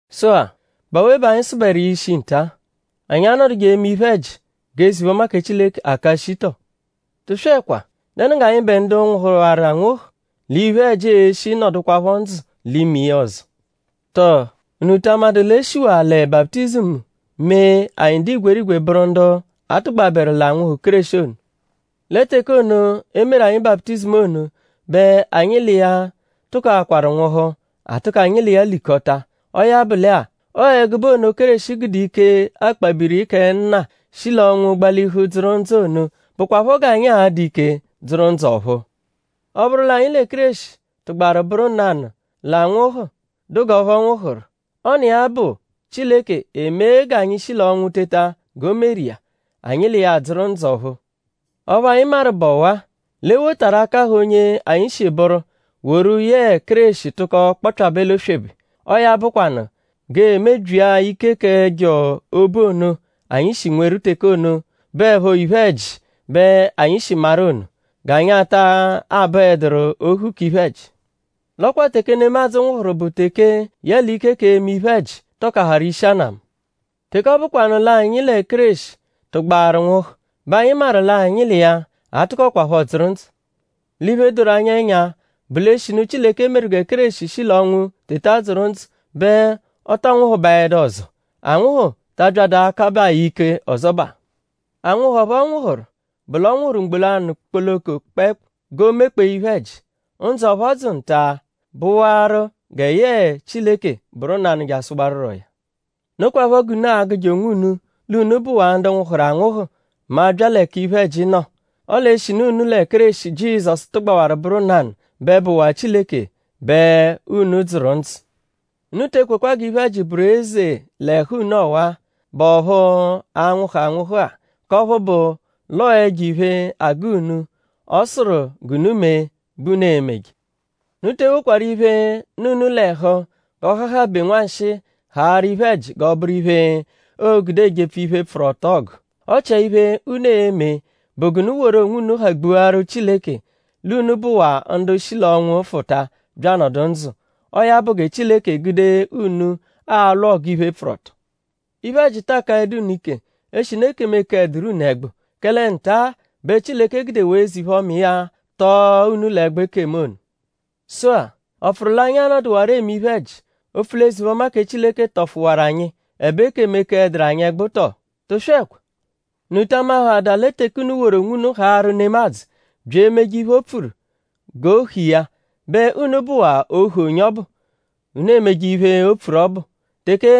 Sụ-a;?bụ awe bẹ anyi sụberu iya ishi nta-a??Anyi a-nọduje eme iphe-ẹji g'eze-iphe-ọma kẹ Chileke aka shii tọ? Tụswekwa!?Dẹnu g'anyịbe ndu nwụhuwaru anwụhu l'iphe-ẹji e-shi nọdukwapho ndzụ l'ime iya ọzo? Tọo?unu ta amadụ l'e shiwaa lẹ baputizimu mee anyi dụ igwerigwe bụru ndu a tụgbaberu l'anwụhu ono, Kéreshi ono? Lẹ teke ono, e meru anyi baputizimu ono bẹ anyi l'iya tụkoakwaru nwụhu; a tụko anyi l'iya likọta. Ọo ya bụ lẹ-a; ọo ẹgube ono Kéreshi gude ike akpabiri kẹ Nna shi l'ọnwu gbalihu dzụru ndzụ ono bụkwapho g'anyi a-dụ ike dzụru ndzụ ọ̀phúú. Ọ -bụru l'anyi lẹ Kéreshi tụgbaru bụru nanụ l'anwụhu, dụ g'ọphu ọ nwụhuru; ọ n'iya bụ Chileke emee g'anyi shi l'ọnwu teta g'o meru iya; anyi l'iya adzụru ndzụ ọ̀phúú. Ọphu anyi maru bụ ọwa-a: l'e wotaru akahụ onye anyi shi bụru woru yẹe Kéreshi tụko kpọpyabe l'oswebe; ọo ya bụkwanu; g'ee-mebyia ike k'ẹjo obu ono, anyi shi nweru teke ono, bụepho iphe-ẹji bẹ anyi shi maru ono; g'anyi ata abụeduru ohu k'iphe-ẹji. L'ọ kwa teke nemadzụ nwụhuru bụ teke yẹle ike k'eme iphe-ẹji tọkaharu ishi anamu. Teke ọ bụkwanu l'anyi lẹ Kéreshi tụgbaru nwụhu bẹ anyi maru l'anyi l'iya a-tụkokwapho dzụru ndzụ. L'iphe doru anyi ẹnya bụ l'eshinu Chileke meru gẹ Kéreshi shi l'ọnwu teta dzụru ndzụ bẹ ọ tọ nwụhubaedu ọzo. Anwụhu ta abyadụ akabaa ya ike ọzobaa. Anwụhu ọphu ọ nwụhuru bụ l'ọ nwụhuru mgbo lanụ kpoloko kpẹekpu g'o mekpee iphe-ẹji. Ndzụ ọphu ọ dzụ nta-a bụwaru gẹ yẹe Chileke bụru nanụ jasụwaruroya. Nokwaphọ g'unu a-gụje onwunu l'unu bụwaa ndu nwụhuru anwụhu mẹ a -bya l'ẹka iphe-ẹji nọ. Ọle eshinu unu lẹ Kéreshi Jizọsu tụgbawaru bụru nanụ bẹ bụwaa Chileke bẹ unu dzụru ndzụ. Unu te ekwekwa g'iphe-ẹji bụru eze l'ẹhu unu ọwa-a, bụ ọphu a-nwụhu anwụhu-a; k'ọphu bụ l'ọo ẹjo-iphe, agụ unu, ọ sụru g'unu mee bẹ unu e-meje. Unu te ewokwaru iphe, nọ unu l'ẹhu g'ọ hahabẹ nwanshịi haarụ iphe-ẹji g'ọ bụru iphe, o gude ejepfu iphe, pfụru ọto ọgu. Ọ chia iphe, unu e-me bụ g'unu woru onwunu hagbuaru Chileke l'unu bụwaa ndu shi l'ọnwu fụta bya anọdu ndzụ. Ọo ya bụ gẹ Chileke egude unu alwụ ọgu iphe, pfụru ọto. Iphe-ẹji ta akaẹdu unu ike; eshinu ekemu ekeẹduru unu ẹgbu; kẹle nta-a bẹ Chileke gudewaa eze-iphe-ọma iya tọo unu l'ẹgbu ekemu ono. Sụ-a;?ọ pfụru l'anyi anọduwaro eme iphe-ẹji; opfu l'eze-iphe-ọma kẹ Chileke tọfuwaru anyi; ẹbe ekemu ekeẹduru anyi ẹgbu tọ? Tụswekwa! Unu ta amahaadaa lẹ teke unu woru onwunu haarụ nemadzụ bya emeje iphe, o pfuru g'ohu iya bẹ unu bụwaa ohu onye ọbu, unu emeje iphe, o pfuru ọbu. Teke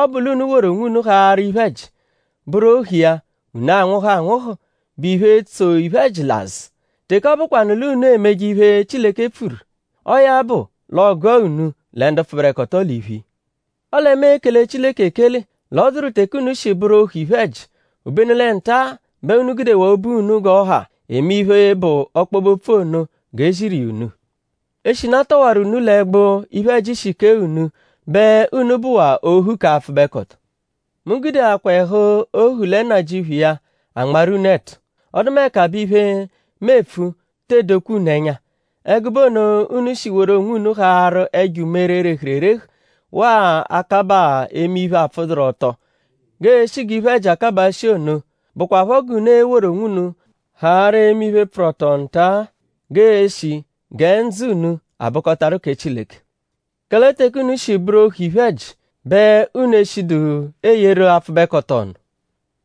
ọ bụ l'unu woru onwunu haarụ iphe-ẹji; bụru ohu iya; unu anwụhu anwụhu, bụ iphe, tso iphe-ẹji l'azụ. Teke ọ bụkwanu l'unu emeje iphe, Chileke pfuru; ọo ya bụ l'ọo-gụa unu lẹ ndu pfụberekoto l'iphu iya. Ọle mu ekele Chileke ekele l'ọ dụru teke unu shi bụru ohu iphe-ẹji; obenu lẹ nta-a bẹ unu gudewaa obu unu g'ọ ha eme iphe, bụ ọkpobe-opfu ono g'e ziru iya unu. Eshinu a tọwaru unu l'ẹgbu, iphe-ẹji shi kee unu bẹ unu bụwaa ohu k'apfụbekoto. Mu gudeakwaa ẹhu ohu lẹ nnajịuphu iya anmarụ unu ẹtu; ọdumeka bẹ iphe, mu epfu te edokwa unu ẹnya. Ẹgube ono unu shi woru onwunu haarụ ẹjo umere, rehuru erehu; waa akabaa eme iphe, apfụduru-ọto g'e-shi g'iphe-ẹji akabaa shii ono; bụkwapho g'unu e-woru onwunu haarụ eme iphe, pfụru ọto nta-a; g'e-shi gẹ ndzụ unu abụkotaru kẹ Chileke. Kẹle teke unu shi bụru ohu iphe-ẹji; bẹ unu eshidu eyeru apfụbekoto ọnu.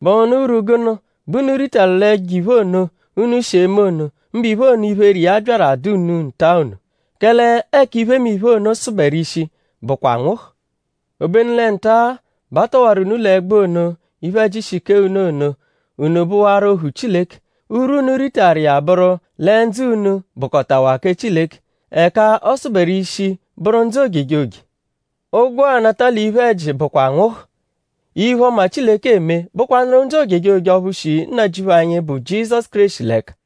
?Bụhunu urwu gụnu bẹ unu ritaru l'ẹjo-iphe ono, unu shi eme ono; mbụ iphe ono, iphere iya byaru adụ unu nta ono? Kẹle ẹka iphemiphe ono sụberu ishi bụkwa anwụhu. Obenu lẹ nta-a bẹ a tọwaru unu l'ẹgbu ono, iphe-ẹji shi kee unu ono; unu bụwaru ohu Chileke. Urwu, unu ritaru iya bụru lẹ ndzụ unu bụkotawaa kẹ Chileke. Ẹka ọ sụberu ishi bụru ndzụ ojejoje. Ụgwo, aanata l'iphe-ẹji bụkwa anwụhu; iphe-ọma, Chileke eme bụkwanuru ndzụ ojejoje ọphu shi Nnajịuphu anyi, bụ Jizọsu Kéreshi l'ẹka.